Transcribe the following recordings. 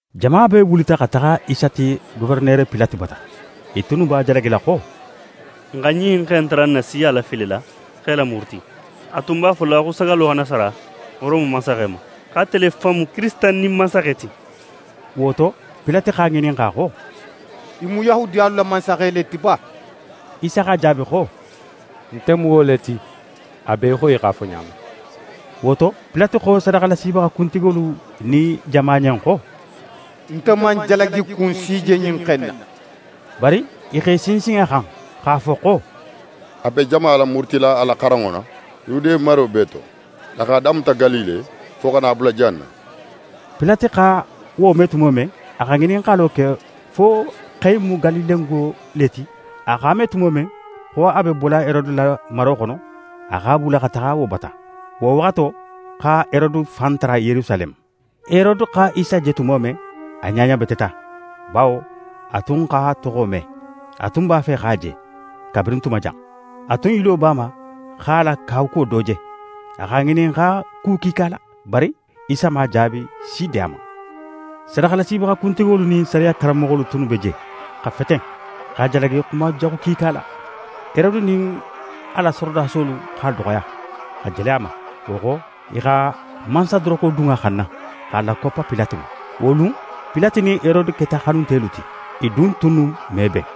Jama bee wulita xa taxa Isa ti Goferenere Pilate bata. I tunnu b'a jalagila xo: «N xa ɲin xe in tara n na siya lafilila x'e lamuruti. A tun b'a fola xo sagallo xana sara Rome mansaxe ma, xo ate le fan mu Kirisita nin mansaxe ti.» Wo to, Pilate x'a ŋininxa xo: «Í mu Yahudiyalu la mansaxe le ti ba?» Isa x'a jaabi xo: «Nte mu wo le ti, a be í xo í x'a fo ɲa men.» Wo to, Pilate xo sadaxalasibaxa kuntigolu nin jama ɲen xo: «Nte man jalagikun si je ɲin xe in na.» Bari i x'e sinsin a xan, x'a fo xo: «A be jama lamurutila a la xaranŋo la Yude maro bee to. A x'a damuta Galile, fo xa na a bula jan na.» Pilate xa wo me tumo men, a xa ŋininxalo ke fo xe in mu Galilengo le ti. A x'a me tumo men, xo a be bola Herode la maro xono, a x'a bula xa taxa wo bata. Wo waxato xa Herode fan tara Yerusaleme. Herode xa Isa je tumo men, a ɲaɲabeteta, bawo a tun x'a toxo me. A tun b'a fe x'a je, kabirin tuma jan. A tun yilo b'a ma x'a la kawakuwo do je. A x'a ŋininxa ku kiika la, bari Isa man jaabi si di a ma. Sadaxalasibaxa kuntigolu nin sariya karanmoxolu tunnu be je, xa feten, x'a jalagi xuma jaxu kiika la. Herode nin a la sorodasolu x'a doxoya, xa jele a ma. Wo xo, i xa mansadoroko dun a xanna, x'a lakoppa Pilate ma. Wo lun, Pilate nin Herode keta xanuntelu ti; i dun tunnu me ben.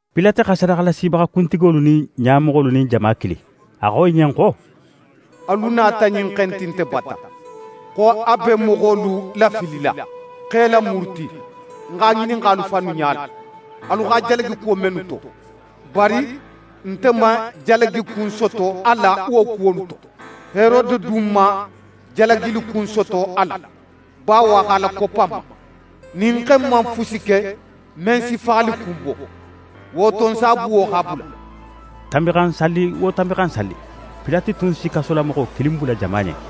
Pilate xa sadaxalasibaxa kuntigolu nin ɲamoxolu nin jama kili. A xo i ɲen xo: «Alu nata ɲin xe in ti nte bata, xo a be moxolu lafilila, x'e lamuruti. Ń x'a ŋininxa alu fannu ɲala, alu x'a jalagi kuwo mennu to, bari nte man jalagikun soto a la wo kuwolu to. Herode du man jalagikun soto a la, bawo a x'a lakoppa n ma. Ɲin xe in man fusi ke men si faxalikun bo. Wo to, ń s'a buwo, x'a bula.» [ Tanbinxansalli wo Tanbinxansalli, Pilate tun si kasolamoxo kilin bula jama ɲen.]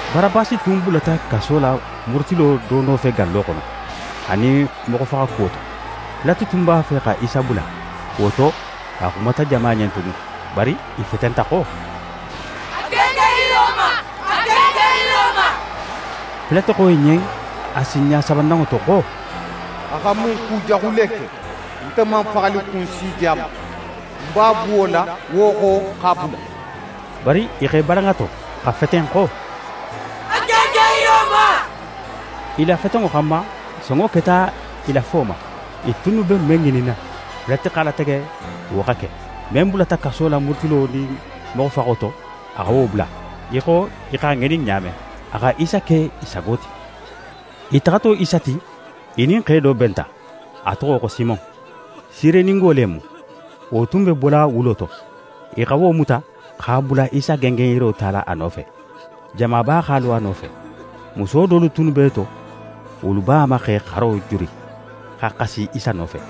Barabasi tun bulata kaso la murutilo do nofe gallo xono, anin moxofaxakuwo to. Pilate tun b'a fe xa Isa bula; wo to, a xumata jama ɲen tugun. Bari i fetenta xo: «A gengen yiro ma! A gengen yiro ma!» Pilate xo i ɲen a sinɲa sabananŋo to xo: «A xa mun kujaxu le ke? Nte man faxalikun si je a ma. Ń b'a buwola, wo xo, x'a bula.» Bari, i x'e balan a to, xa feten xo: «A gengen yiro ma!» I la fetenŋo xanma, sonŋo keta i la fo ma. I tunnu be men ŋininna, Pilate x'a latege wo xa ke. Men bulata kaso la murutilo nin moxofaxo to, a xa wo bula, í xo i x'a ŋinin ɲa men. A xa Isa ke i sago ti. I taxato Isa ti, i nin xe do benta, a toxo xo Simon. Sireningo le mu. Wo tun be bola wulo to. I xa wo muta, x'a bula Isa gengenyiro tala a nofe. Jamaba x'a lo a nofe. Muso dolu tunnu b'e to, wolu b'a ma x'e xaro juri, xa xasi Isa nofe.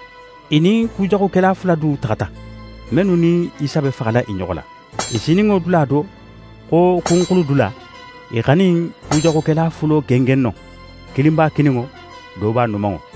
I nin kujaxukela fula du taxata, mennu nin Isa be faxala i ɲoxo la. I sininŋo dula do xo «Kunxuludula», i x'a nin kujaxukela fulo gengen non. Kilin b'a kininŋo, do b'a numanŋo.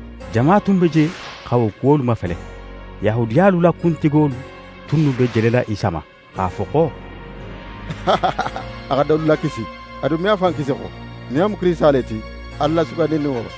Jama tun be je xa wo kuwolu mafele. Yahudiyalu la kuntigolu tunnu be jelela Isa ma, x'a fo xo: «A xa dolu lakisi! A dun me a fan kisi xo, nin a mu Kirisita le ti, Ala la Sugandininŋo.»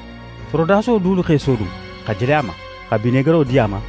Sorodaso dulu x'e sodun, xa jele a ma, xa binegaro di a ma,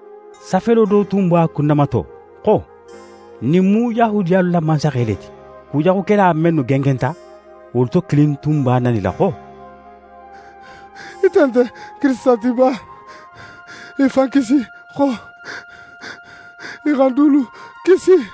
Safelo do tun b'a kunnamato xo: «Ɲin mu Yahudiyalu la mansaxe le ti.» Kujaxukela mennu gengenta, wolu to kilin tun b'a nanila xo: «Ite nte Kirisita ti ba? Í fan kisi xo, xa n dulu kisi!»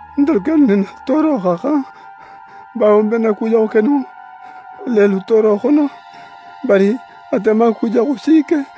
Ntelu kennu nin n na tooro xa xan, bawo n be n na kujaxu keninŋo lelu tooro xono; bari ate man kujaxu si ke.»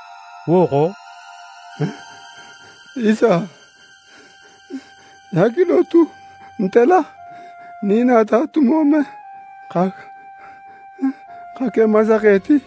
Wo xo: «Isa, í hakilo tu nte la, nin í nata tumo men xa ke mansaxe ti.»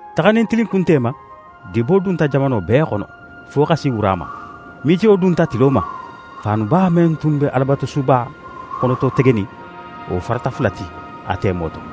Taxanin tilinkunte ma, dibo dunta jamano bee xono, fo xa si wura ma. Mitiyo dunta tilo ma. Faanuba men tun be Alabatusuba xonototegenin, wo farata fula ti a temo to.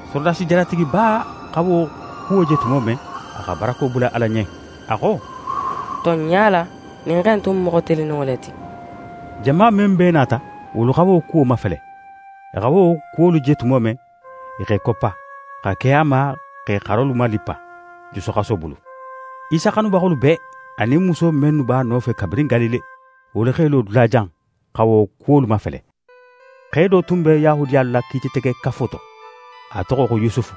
Sorodasi jalatigiba xa wo kuwo je tumo men, a xa barako bula Ala ɲen. A xo: «Tonɲa la, ɲin xe in tun mu moxo tilinninŋo le ti!» Jama men bee nata, wolu xa wo kuwo mafele. I xa wo kuwolu je tumo men, i x'e koppa, xa ke a ma x'e xarolu malippa jusuxaso bulu. Isa xanubaxolu bee, anin muso mennu b'a nofe kabirin Galile, wolu x'e lo dulajan, xa wo kuwolu mafele. Xe do tun be Yahudiyalu la Kiititegekafo to, a toxo xo Yusufu.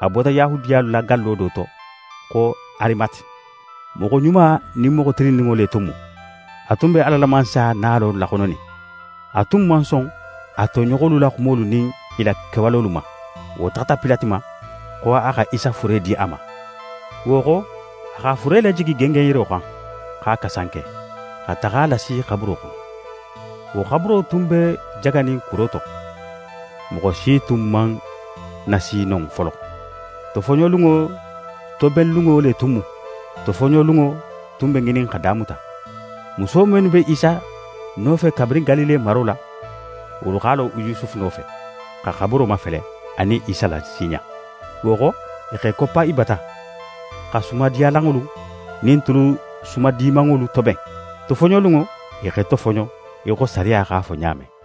A bota Yahudiyalu la gallo do to xo Arimate. Moxo ɲuma nin moxo tilinninŋo le tun mu. A tun be Ala la Mansaya nalo laxononin. A tun man son a toɲoxolu la xumolu nin i la kewalolu ma. Wo taxata Pilate ma, xo a xa Isa fure di a ma. Wo xo, a x'a fure lajigi gengenyiro xan, x'a kasanke, xa taxa a lasi xaburo xono. Wo xaburo tun be jaganin kuro to. Moxo si tun man nasi non folo. Tofoɲolunŋo tobenlunŋo le tun mu, tofoɲolunŋo tun be ŋinin xa damuta. Muso mennu be Isa nofe kabirin Galile maro la, wolu x'a lo Yusufu nofe, xa xaburo mafele, anin Isa lasiɲa. Wo xo, i x'e koppa i bata, xa sumadiyalanŋolu nin tulu sumadimanŋolu toben. Tofoɲolunŋo, i x'e tofoɲo í xo sariya x'a fo ɲa men.